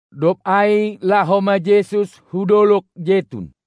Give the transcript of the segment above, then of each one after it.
Dob ai laho ma Jesus hu dolog Jetun.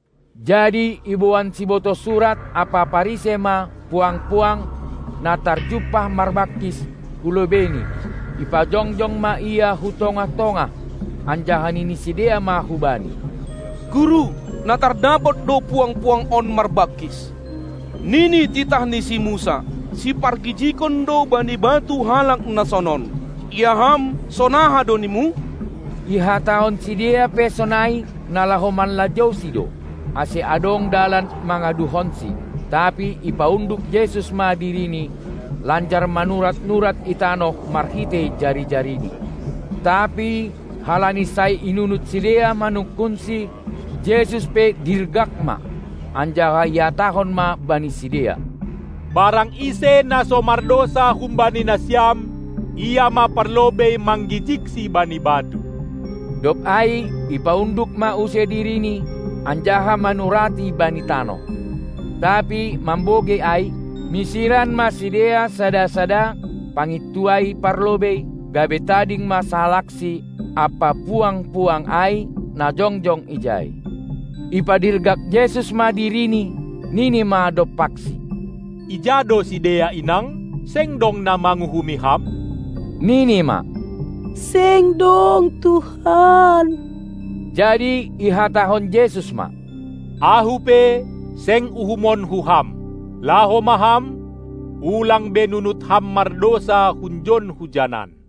Jadi iboan sibotoh surat ampa Parisei ma puang-puang, na tarjumpah marbangkis, hu lobeiNi, ipajongjong ma ia hu tongah-tongah, anjaha nini sidea ma hu Bani: Guru, na tardapot do puang-puang on marbangkis. Nini titah ni si Musa, sipargijigon do bani batu halak na sonon; ia Ham, sonaha do nimu? Ihatahon sidea pe sonai, na laho manlajouSi do, ase adong dalan mangaduhonsi. Tapi ipaunduk Jesus ma dirini, lanjar manurat-nurat i tanoh marhitei jari-jariNi. Tapi halani sai inunut sidea manungkunSi, Jesus pe dirgak ma, anjaha ihatahon ma bani sidea: Barang ise na so mardousa humbani nasiam, ia ma parlobei manggijigsi bani batu. Dob ai ipaunduk ma use dirini, anjaha manurati bani tanoh. Tapi mambogei ai, misiran ma sidea sada-sada, pangintuai parlobei, gabe tading ma sahalakSi ampa puang-puang ai, na jongjong ijai. Ipadirgak Jesus ma dirini, nini ma dompaksi: Ija do sidea inang? Seng dong na manguhumi ham? Nini ma: Seng dong Tuhan. Jadi ihatahon Jesus ma: Ahu pe, seng uhumonKu ham. Laho ma ham, ulang be nunut ham mardousa hunjon hujanan!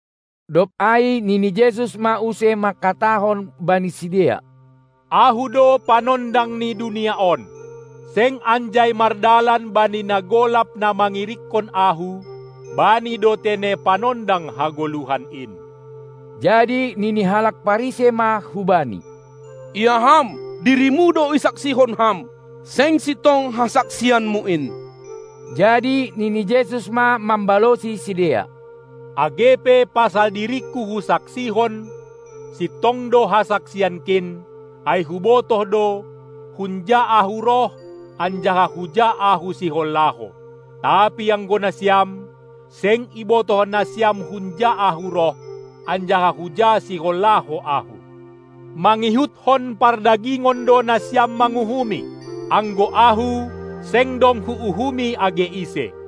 Dob ai nini Jesus ma use mangkatahon bani sidea: Ahu do panondang ni dunia on. Seng anjai mardalan bani na golap na mangirikkon Ahu, bani do tene Panondang hagoluhan in. Jadi nini halak Parisei ma hu Bani: Ia Ham, dirimu do isaksihon Ham; seng sintong hasaksianMu in. Jadi nini Jesus ma mambalosi sidea: Age pe pasal diringKu Husaksihon, sintong do hasaksianKin, ai Hubotoh do, hunja Ahu roh anjaha huja Ahu sihol laho. Tapi anggo nasiam, seng ibotoh nasiam hunja Ahu roh anjaha huja sihol laho Ahu. Mangihutkon pardagingon do nasiam manguhumi. Anggo Ahu, seng dong Huuhumi age ise.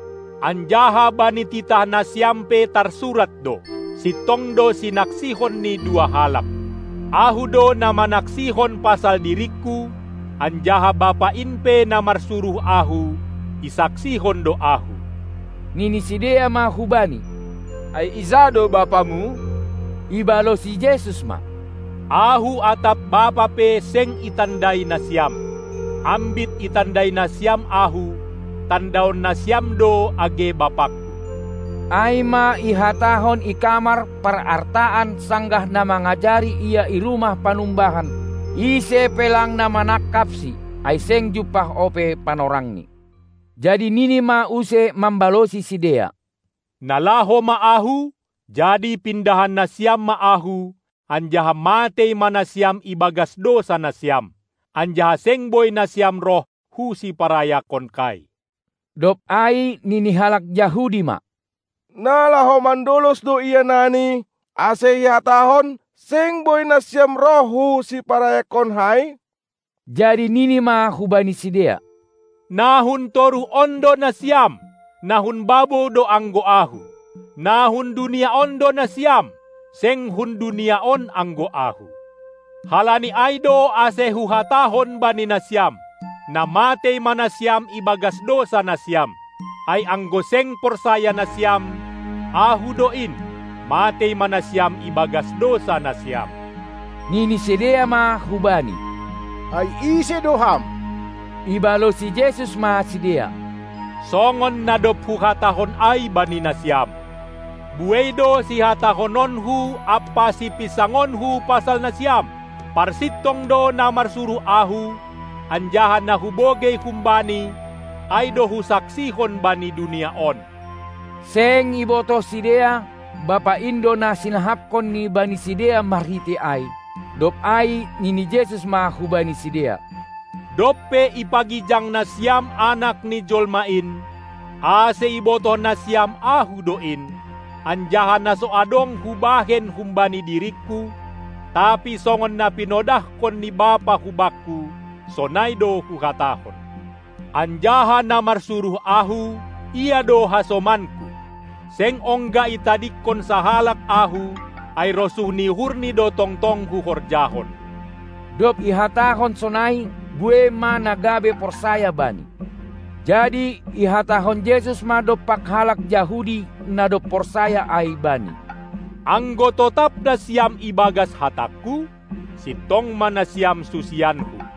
Anjaha bani titah nasiam pe tarsurat do: Sintong do sinaksihon ni dua halak. Ahu do na manaksihon pasal diringKu, anjaha Bapa in pe, na marsuruh Ahu, isaksihon do Ahu. Nini sidea ma hu Bani: Ai ija do BapaMu? Ibalosi Jesus ma: Ahu atap Bapa pe, seng itandai nasiam. Ambit itandai nasiam Ahu, tandaon nasiam do age BapaKu. Ai ma ihatahon i kamar parartaan, sanggah na mangajari Ia i rumah panumbahan. Ise pe lang na manangkapSi, ai seng jumpah ope panorangni. Jadi nini ma use mambalosi sidea: Na laho ma Ahu, jadi pindahan nasiam ma Ahu, anjaha matei ma nasiam ibagas dousa nasiam. Anjaha seng boi nasiam roh hu siparayakonkai. Dob ai nini halak Jahudi ma: Na laho mandolos do Ia nani, ase ihatahon: Seng boi nasiam roh hu siparayakonkai? Jadi nini ma hubani sidea: Na hun toruh on do nasiam, na hun babou do anggo Ahu. Na hun dunia on do nasiam, seng hun dunia on anggo Ahu. Halani ai do ase Huhatahon bani nasiam: Na matei ma nasiam ibagas dousa nasiam. Ai anggo seng porsaya nasiam, Ahu do In, matei ma nasiam ibagas dousa nasiam. Nini sidea ma hu Bani: Ai ise do Ham? Ibalosi Jesus ma sidea: Songon na dob Huhatahon ai bani nasiam! Buei do sihatahononKu ampa sipinsangonKu pasal nasiam. Parsintong do na marsuruh Ahu, anjaha na Hubogei hum-Bani, ai do Husaksihon bani dunia on. Seng ibotoh sidea, Bapa in do na sinahapkonNi bani sidea marhitei ai. Dob ai nini Jesus ma hubani sidea: Dob pe ipagijang nasiam Anak ni Jolma in, ase ibotoh nasiam Ahu do in, anjaha na so adong Hubahen humbani diringKu, tapi songon na pinodahkon ni Bapa hu Bakku, sonai do Huhatahon. Anjaha na marsuruh Ahu, Ia do hasomanKu. Seng ongga itadingkon sahalak Ahu, ai rosuh ni uhurNi do tongtong Huhorjahon. Dob ihatahon sonai, buei ma na gabe porsaya Bani. Jadi ihatahon Jesus ma dompak halak Jahudi na dob porsaya ai Bani: Anggo totap nasiam ibagas hatangKu, sintong ma nasiam susianKu.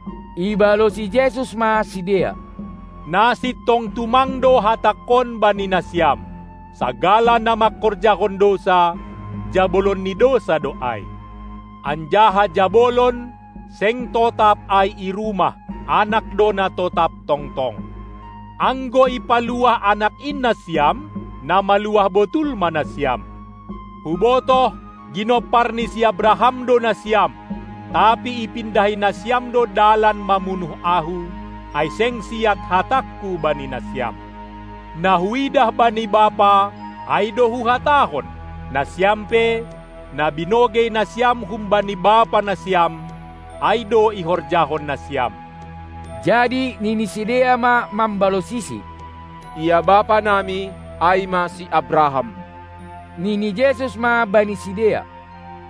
Ibalosi Jesus ma sidea: Na sintong tumang do hatangkon bani nasiam: Sagala na mangkorjahon dousa, jabolon ni dousa do ai. Anjaha jabolon, seng totap ai i rumah; anak do na totap tongtong. Anggo ipaluah Anak in nasiam, na maluah botul ma nasiam. Hubotoh, ginompar ni si Abraham do nasiam, tapi ipindahi nasiam do dalan mamunuh Ahu, ai seng siat hatangKu bani nasiam. Na Huidah bani Bapa, ai do Huhatahon; nasiam pe, na binogei nasiam humbani bapa nasiam, ai do ihorjahon nasiam. Jadi nini sidea ma mambalosiSi: Ia bapa nami, ai ma si Abraham. Nini Jesus ma bani sidea: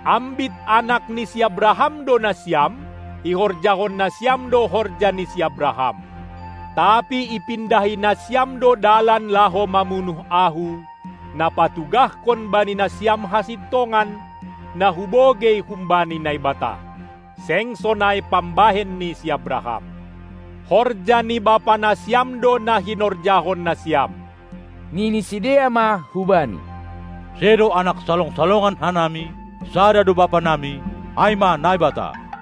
Ambit anak ni si Abraham do nasiam, ihorjahon nasiam do horja ni si Abraham. Tapi ipindahi nasiam do dalan laho mamunuh Ahu, na patugahkon bani nasiam hasintongan, na Hubogei humbani Naibata. Seng sonai pambahen ni si Abraham. Horja ni bapa nasiam do na hinorjahon nasiam. Nini sidea ma hu-Bani: Sedo anak salong-salongan hanami, sada do bapa nami, ai ma Naibata.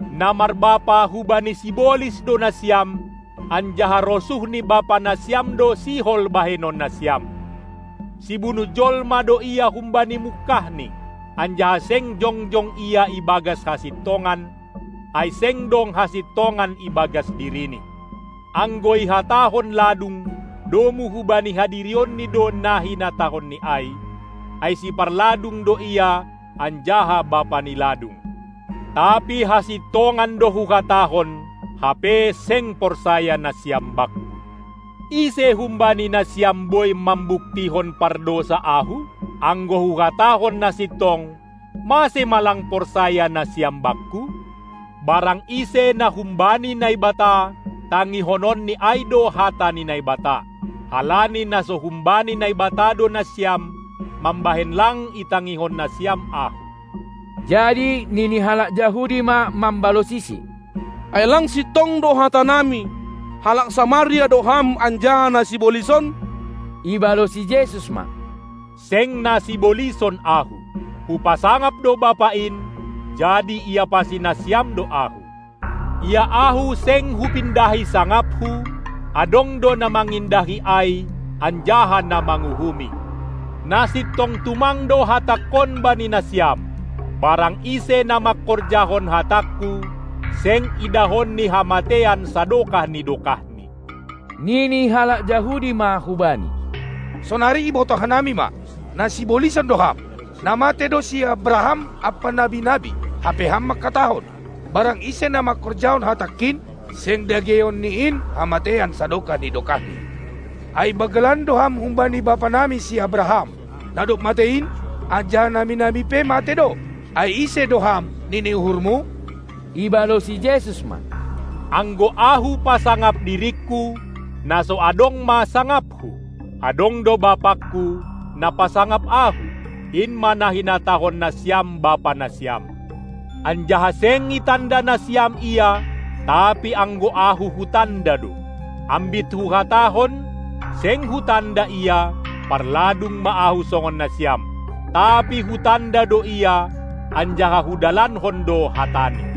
Na marbapa hubani sibolis do nasiam, anjaha rosuh ni bapa nasiam do sihol bahenon nasiam. Sibunuh jolma do ia humbani mungkahni, anjaha seng jongjong ia i bagas hasintongan, ai seng dong hasintongan i bagas dirini. Anggo ihatahon ladung, domu hubani hadirionni do na hinatahonni ai, ai siparladung do ia anjaha bapa ni ladung. Tapi hasintongan do Huhatahon, hape seng porsaya nasiam Bakku. Ise humbani nasiam boi mambuktihon, pardousa Ahu? Anggo Huhatahon na sintong, mase ma lang porsaya nasiam Bakku? Barang ise na humbani Naibata, tangihononni ai do hata ni Naibata. Halani na so humbani Naibata do nasiam mambahen lang itangihon nasiam Ahu. Jadi nini halak Jahudi ma mambalosiSi: Ai lang sintong do hata nami, halak Samaria do Ham anjaha na sibolison? Ibalosi Jesus ma: Seng na sibolison Ahu; Hupasangap do Bapa in, jadi iapasi nasiam do Ahu. Ia Ahu seng Hupindahi sangapHu; adong do na mangindahi ai anjaha na manguhumi. Na sintong tumang do hatangKon bani nasiam: Barang ise na mangkorjahon hatangKu, seng idahonni hamateian sadokah ni dokahni. Nini halak Jahudi ma hu Bani: Sonari ibotoh hanami ma, na sibolison do Ham. Na matei do si Abraham ampa nabi-nabi, hape Ham mangkatahon: Barang ise na mangkorjahon hatangKin, seng dageion ni in hamateian sadokah ni dokahni. Ai banggalan do Ham humbani bapa nami si Abraham, na dob matei in? Anjaha nabi-nabi pe matei do. Ai ise do Ham, nini uhurMu? Ibalosi Jesus ma: Anggo Ahu pasangap diringKu, na so adong ma sangapHu. Adong do BapangKu, na pasangap Ahu, in ma na hinatahon nasiam Bapa nasiam. Anjaha seng itanda nasiam Ia, tapi anggo Ahu Hutanda do. Ambit Huhatahon, seng Hutanda Ia, parladung ma Ahu songon nasiam. Tapi Hutanda do Ia, anjaha Hudalankon do hataNi.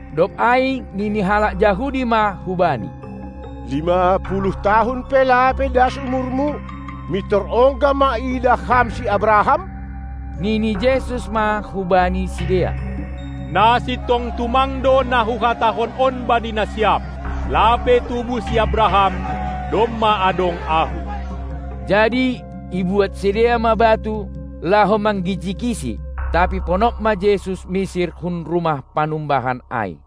Dob ai nini halak Jahudi ma hu Bani: Lima puluh tahun pe lape das umurMu, mintor ongga ma iidah Ham si Abraham? Nini Jesus ma hubani sidea: Na sintong tumang do na Huhatahon on bani nasiam: Lape tubuh si Abraham, domma adong Ahu. Jadi ibuat sidea ma batu, laho manggijigiSi, tapi ponop ma Jesus misir hun rumah panumbahan ai.